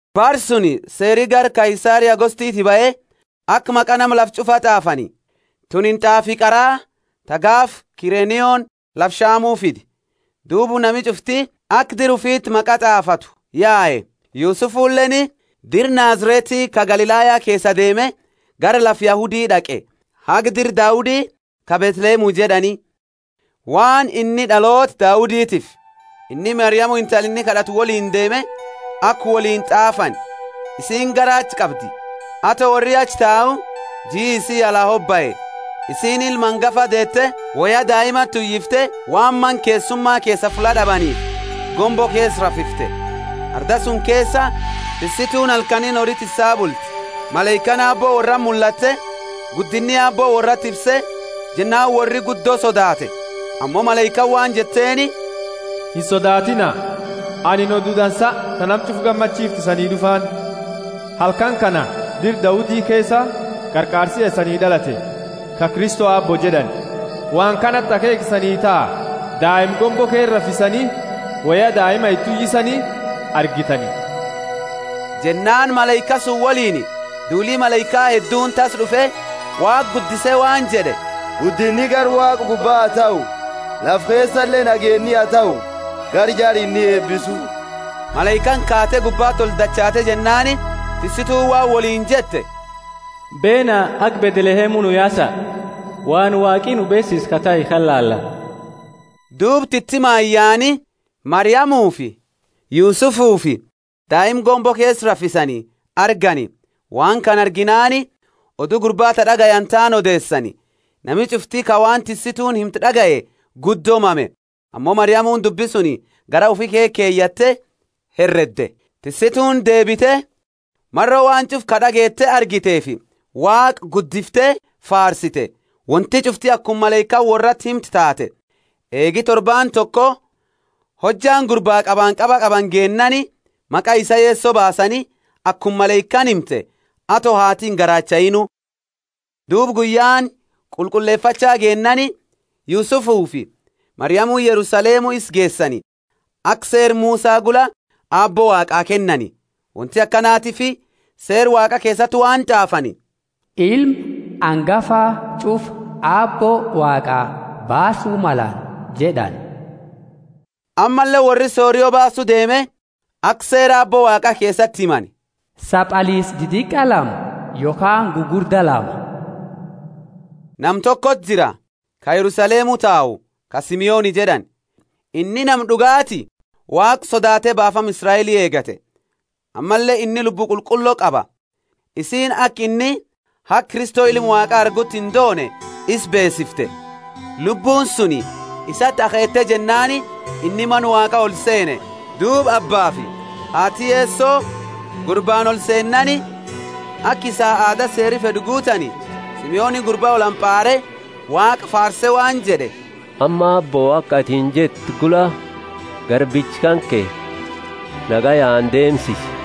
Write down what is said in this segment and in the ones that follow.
Bara suni seeri gara Kaisari Augustoti bahe aka maqa nama lafa ch'ufa t'aafani. Tunini t'aafi qara, ta gaafa Kirenioni lafa Shamu fide. Duuba nami ch'ufti aka dira ufiti maqa t'aafatu yae. Yusufuleeni dira Nazareti ka Galilaya keesaa deeme, gara lafa Yahudi d'aqe, haga dira Daudi ka Bethlehemu jed'ani, waan inni d'aloota Dauditiifi. Inni Mariamu intala inni kad'ate woliini deeme aka woliini t'aafani; isiini garaacha qabdi. Ato worri achi tau jii isii ala hobae. Isiini ilma angafa deete, woya daimati uyifte, waan mana keessuma keesaa fulla d'abaniifi, gombo keesa rafifte. Arda suni keesa tissituuni halkaniini hori tissaa bulti. Malaikaani Aabbo worrati mullatte, guddinni Aabbo worrati ifse, jennaani worri guddo sodaate. Ammo malaikaani waan jetteeni, Insodaatiina! Anini odu dansa ta nama ch'ufa gammachiiftu isanii d'ufaani. Halkani kana dira Daudi keesa Qarqaarsi ya isanii d'alate, ka Kristo Aabbo jed'ani. Waan kanati akheekha isanii taha: daima gombo keesa rafisani woya daima iti uyisani argitani. Jennaani malaika suni woliini duuli malaika hedduuni tassa d'ufe, Waaqa guddise waan jed'e: Guddinni gara Waaqa gubba ha tahu: Lafa keesale nageenni ha tahu gara jara inni eebisu. Malaikaani kaate gubbati oldachaate jennaani tissituuni waan woliini jette, Beena, haga Bethlehemu nuu yaasa, waan Waaqi nu beesise ka tahe kana laalla. Duuba titimaani yaani Mariamufi Yusufufi daima gombo keesa rafisani argani. Waan kana arginaani odu gurba ta d'agayani taani odeesani. Nami ch'ufti ka waan tissituuni himte d'agaye guddo mame. Ammo Mariamuni dubbi suni garaa ufi keesa keyatte heredde. Tissituuni deebite, maro waan ch'ufa ka d'ageete argiteefi Waaqa guddifte faarsite. Wonti ch'ufti akuma malaikaani worrati himte taate. Eegi torbaani toko, hojjaani gurba qabanqaba qabani geennaani maqa isaa Yeso baasani, akuma malaikaani himte, ato haati ingaraachainu. Duuba guyyaani qulqullefacha geennaani, Yusufufi Mariamuni Yerusalemu isa geesani, aka Seera Musa gula Aabbo Waaqaa kennani. Wonti akanatiifi Seera Waaqa keesati waan t'aafani: ilma angafa ch'ufa Aabbo Waaqa baasu malani jed'ani. Ammalle worri sorio baasu deeme, aka Seera Aabbo Waaqa keesati himani: Sabaliisa didiqa lama yokhaani gugurda lama. Nama tokoti jira ka Yerusalemu tau ka Simeoni jed'ani, inni nama d'ugaati Waaqa sodaate baafama Israeli eegata. Ammalle inni Lubbu Qulqullo qaba. Isiini aka inni haga Kristo ilma Waaqa arguti indoone isa beesifte. Lubbuuni suni isati akheete jennaani inni Mana Waaqa olseene. Duuba abbaafi haati Yeso gurbaani olseennaani, aka isaa aada Seeri fed'u guutani, Simeoni gurba olhampaare, Waaqa faarse, waan jed'e: Amma, Aabbo, aka atini jette gula, garbicha kanke nagayaani deemsisi.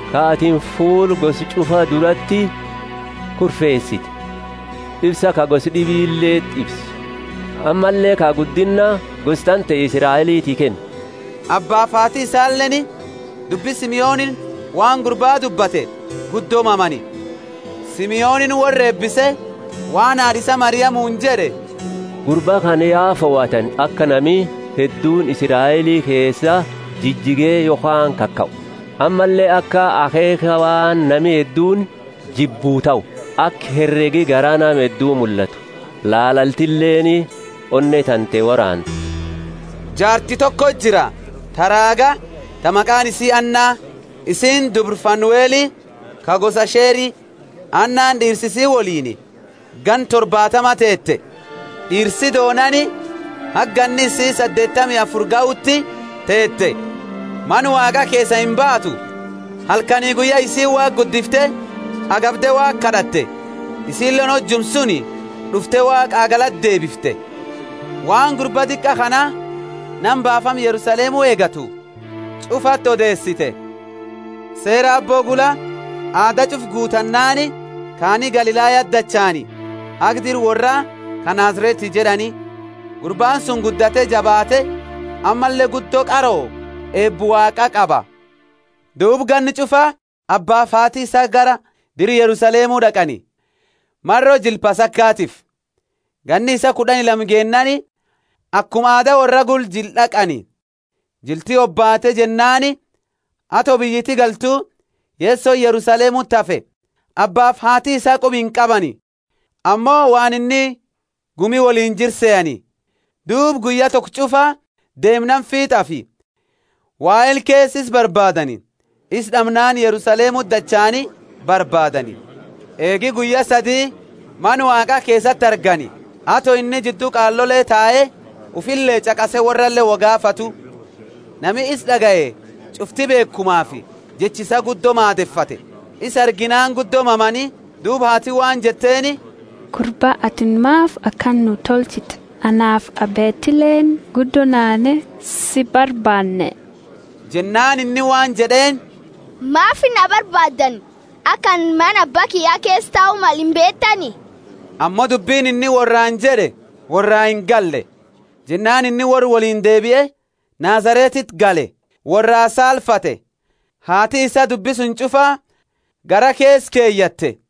ka atini fuula gosa ch'ufa durati kurfeesite: Ifsa ka gosa d'ibileti ifsu, ammalle ka guddinna gosa tante Israeliti kennu. Abbaafi haati isaleeni dubbi Simeonini waan gurba dubbate guddo mamani. Simeonini worra eebise waan haad'a isaa Mariamuni jed'e, Gurba kana ya fohatani aka nami hedduuni Israeli keesa jijige yokhaani kakau, ammalle aka akheekha waan nami hedduuni jibbu tahu, aka heregi garaa nama heddu mullatu. Laalaltileeni onne tante woraanti. Jaarti toko jira ta raaga ta maqaani isi Anna. Isiini dubra Fanueli ka gosa Asheri. Annani d'iirsa isi woliini ganna torbaatama teete. D'iirsi doonaani haga ganni isii saddeetami afuri gahuti teete; Mana Waaqa keesaa imbaatu, halkani guyya isiini Waaqa guddifte agabde Waaqa kad'atte. Isiileeni hojuma suni d'ufte Waaqaa galata deebifte, waan gurba diqa kana nama baafama Yerusalemu eegatu ch'ufati odeesite. Seera Aabbo gula aada ch'ufa guutannaani kaani Galilayati dachaani, haga dira worra ka Nazareti jed'ani. Gurbaani suni guddate jabaate; ammalle guddo qaroo, eeba Waaqa qaba. Duuba ganna ch'ufa abbaafi haati isaa gara dira Yerusalemu d'aqani, maro jila Pasakatiifi. Ganni isaa kud'ani lama geennaani akuma aada worra gula jila d'aqani. Jilti hobaate jennaani, ato biyyiti galtu, Yesoni Yerusalemuti hafe. Abbaafi haati isaa quba inqabani. Ammo waan inni gumi woliini jiru sehani, duuba guyya toko ch'ufa deemnaani fiit'afi wahela keesa isa barbaadani. Isa d'amnaani Yerusalemuti dachaani barbaadani. Eegi guyya sadi Mana Waaqa keesati argani, ato inni jiddu qaalole tae ufile ch'aqase worrale wo gaafatu. Nami isa d'agaye ch'ufti beekhumafi jecha isaa guddo maadefate. Isa arginaani guddo mamani, duuba haati waan jetteeni, Gurba, atini maafi akana nuu tolchite? Anaafi abbetileeni guddo naane si barbaanne. Jennaani inni waan jed'eeni, Maafi na barbaaddani? Aka anini mana Abba kiyya keesa tau male imbeetani? Ammo dubbini inni worraani jed'e worraa ingalle. Jennaani inni worra woliini deebie, Nazaretiti gale, worra saalfate. Haati isaa dubbi suni ch'ufa garaa keesa keyatte.